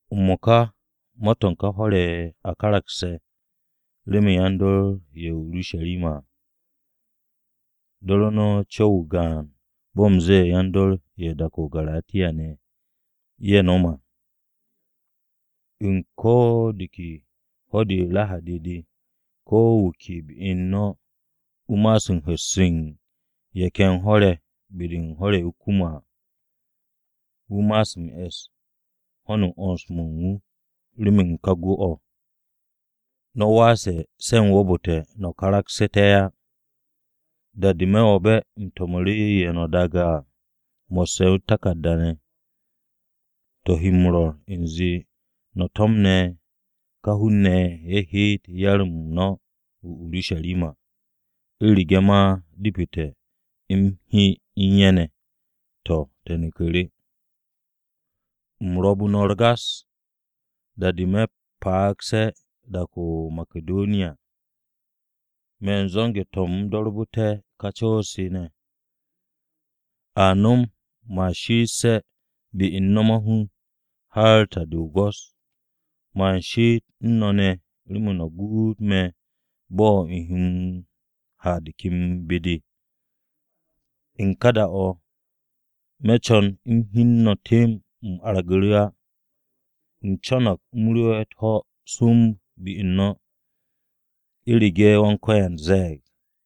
M-mo̱ka, ma-to̱ u̱n ka hwo̱r-ye̱ a karakse̱, remen yan-dor ye̱ o-Urusharima à. Do̱ru̱ no̱ co̱w-o o-gaan bo̱ u̱m zee yan-dor ye̱ u̱n dak-o̱ o-Garatiya ye̱ nom à. U̱n ko̱ de ke ho̱-de o-Rahadi de, ko wu̱ ke be u̱n no̱ wu̱ ma'as u̱n hu̱s u̱n ye̱ ken hwo̱-ye̱ be-de u̱n hwo̱r-ye̱ wu̱ ro̱ m-kum à. Wu̱ ma'as m-e̱s ho̱n u̱n 'wo̱ns-mo̱ u̱n wu̱ remen ka gwu̱-o̱. No̱ waase̱ se̱ u̱m wo̱o̱bu̱te̱ no̱ karagsu̱te̱ á. Da-de me̱ wo̱be̱ u̱m to̱mu̱ru̱ ye̱ no̱ daage̱ à, mo̱sse̱ u̱t-taku̱rda ne̱, to̱ he m-rwo̱r u̱nze no̱ to̱mne̱ ka hun-ne̱ ye̱ heet yar-m no̱ o-Urusharima. U̱rege̱ ma depete̱ u̱m he u̱n ye̱ ne̱, to̱, te̱ neku̱ru̱. U̱m ro̱be̱ no̱ u̱r-gas, da-o̱ me̱ pa'agse̱ dak-o̱ o-Makidoniya. Me̱ u̱n zo̱nge̱-to̱ u̱m m-do̱rbu̱te̱ ka co̱-se ne̱. A nom man she'esse̱ be u̱n no̱ m-mahun har ta-de o-go̱s. Man she'et u̱n no̱ ne̱ remen no̱ guut me̱ bo̱ u̱m he m-ha de ken be-de à. U̱n ka da-o̱, me̱ co̱n u̱m hyen no̱ temb u̱m argu̱ru̱ á. U̱m co̱no̱g u̱m rewe̱ u̱t-ho̱ be u̱n no̱, u̱rege̱ Wan-Ko̱yan ze̱e̱g.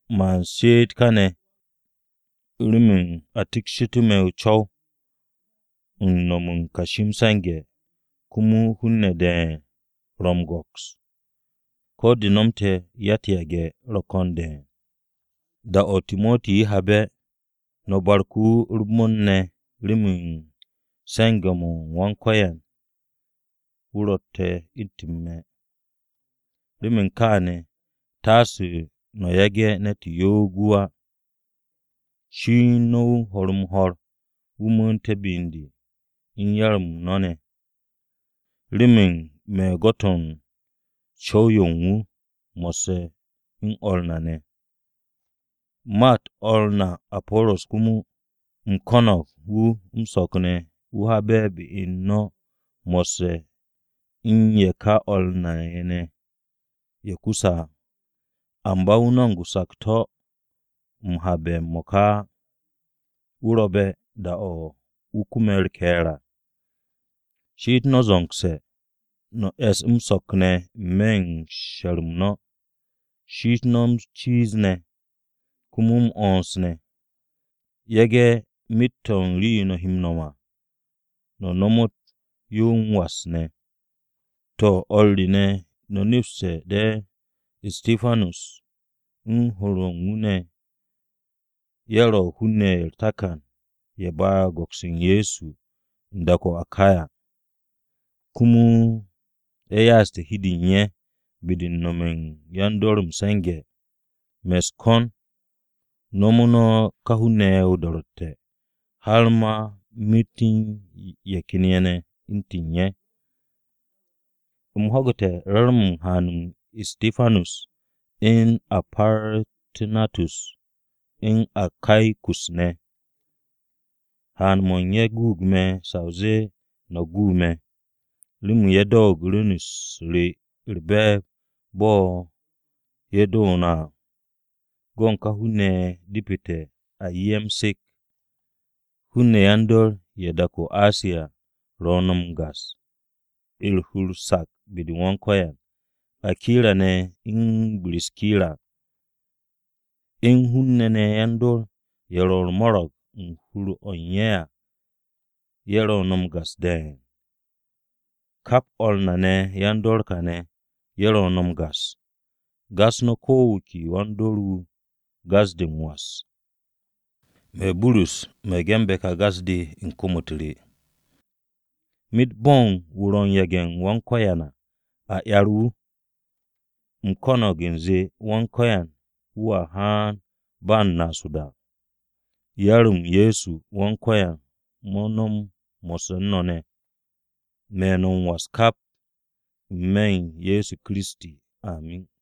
Man she'et káne̱ remen a tiksshitu̱ me̱ co̱w-yo u̱n no̱m u̱n kashi m-se̱nge̱ komo hun-ne̱ de̱e̱n ro̱ m-go̱ks, ko̱ de nomte̱ à ya-u̱t-yage̱ ro̱ ko̱n de̱e̱n. Da-o̱ Timoti habe̱, no̱ barku̱ wu̱ u̱r-bon ne̱ remen se̱nge̱-m Wan-Ko̱yan wu̱ ro̱tte̱ u̱ntu̱n me̱. Remen kaane̱ taase no̱ yage̱ ne̱t yo'og wu̱ á. Shini no̱ wu̱ ho̱r-m-ho̱r wu̱ mu̱u̱nté̱ be u̱n de, u̱n yar-m no̱ ne̱, remen me̱ u̱n gwo̱t-o̱ u̱n co̱w-yo u̱n wu̱ mo̱sse̱ u̱n o̱r na ne̱. Ma-u̱t o̱r na Apo̱ro̱s komo, u̱m ko̱no̱g wu̱ m-so̱k ne̱ wu̱ habe̱ be u̱n no̱ mo̱sse̱ u̱n ye̱ ká o̱r na ye̱ ne̱ ye̱ kuse̱ à. Amba wu̱ no̱m sakto̱-o̱ m-habe̱ m-mo̱ka á. Wu̱ ro̱be̱ da-o̱ wu̱ kume̱ u̱r-ke̱e̱r à. She'et no̱ zo̱ngse̱, no̱ es m-so̱k ne̱ ne̱ n-me̱ u̱n she̱r-m no̱. She'et no̱ m-ciiz ne̱. Komo m-'wo̱ns ne̱. Yage̱ myet-o̱ u̱n rii-yo no̱ he m-no̱m à, no̱ nomot yo m-was ne̱. To̱, o̱r re ne̱, no̱ nepste̱ de̱ Istipanus u̱n hur-o̱ u̱n wu̱ ne̱ ye̱ ro̱ hun-ne̱ ye̱ u̱r-takan ye̱ ba'e̱ go̱ks u̱n Ye̱so u̱n dak-o̱ o-Akaya, komo ye̱ ya'aste̱ hi u̱n de u̱n ye̱ be-de u̱n nome̱ u̱n yan-dor m-se̱nge̱. Me̱ no̱ u̱s-ko̱n nomo no̱ ká hun-ne̱ ye̱ o-do̱ro̱tte̱, har ma myet u̱n ye̱ ken ye̱ ne̱ u̱ntu̱n ye̱. U̱m ho̱gu̱te̱ re̱re̱m-mo̱ u̱n haan-m Istipanus, u̱n Partu̱natus, u̱n Akaikus ne̱. Haan-mo̱ u̱n ye̱ guug me̱ sa o zee no̱ ye̱ gu me̱. Remen ye̱ doote̱ rwu̱n-u̱s re u̱r-be̱e̱b, bo̱ ye̱ doo no̱ à. Go̱ u̱n ká hun-ne̱ ye̱ depete̱ a 'ye ye̱ m-se̱k. Hun-ne̱ yan-dor ye̱ u̱n dak-o̱ o-Asiya ro̱ no̱ u̱r-gas, u̱r-hur sak be-de u̱n Wan-Ko̱yan. Akira ne̱ u̱n Biskira, u̱n hun-ne̱ ne̱ yan-dor ye̱ ro̱ u̱r-mo̱ro̱g u̱n hur-o̱ u̱n ye̱ à, ye̱ ro̱ no̱ u̱r-gas de̱e̱n. Kap o̱r na ne̱ yan-dor kaane̱ ye̱ ro̱ no̱ u̱r-gas. Gas no̱ ko̱ wu̱ ke wan-dor-wu̱ gas-de m-was. Me̱, Burus, me̱ ge̱nbe̱ kà gas-de u̱n kom-u̱t re. Myet bo̱n wu̱ ro̱ u̱n yage̱-u̱t Wan-Ko̱yan à, a 'yer wu̱! U̱m ko̱no̱g u̱nze Wan-Ko̱yan wu̱a haan ba m-naas o-da. Yar-m Ye̱so Wan-Ko̱yan mo̱ no̱m mo̱sse̱ u̱n no̱ ne̱! Me̱ no̱ m-was kap, n-me̱ u̱n Ye̱so Kiristi. Amin.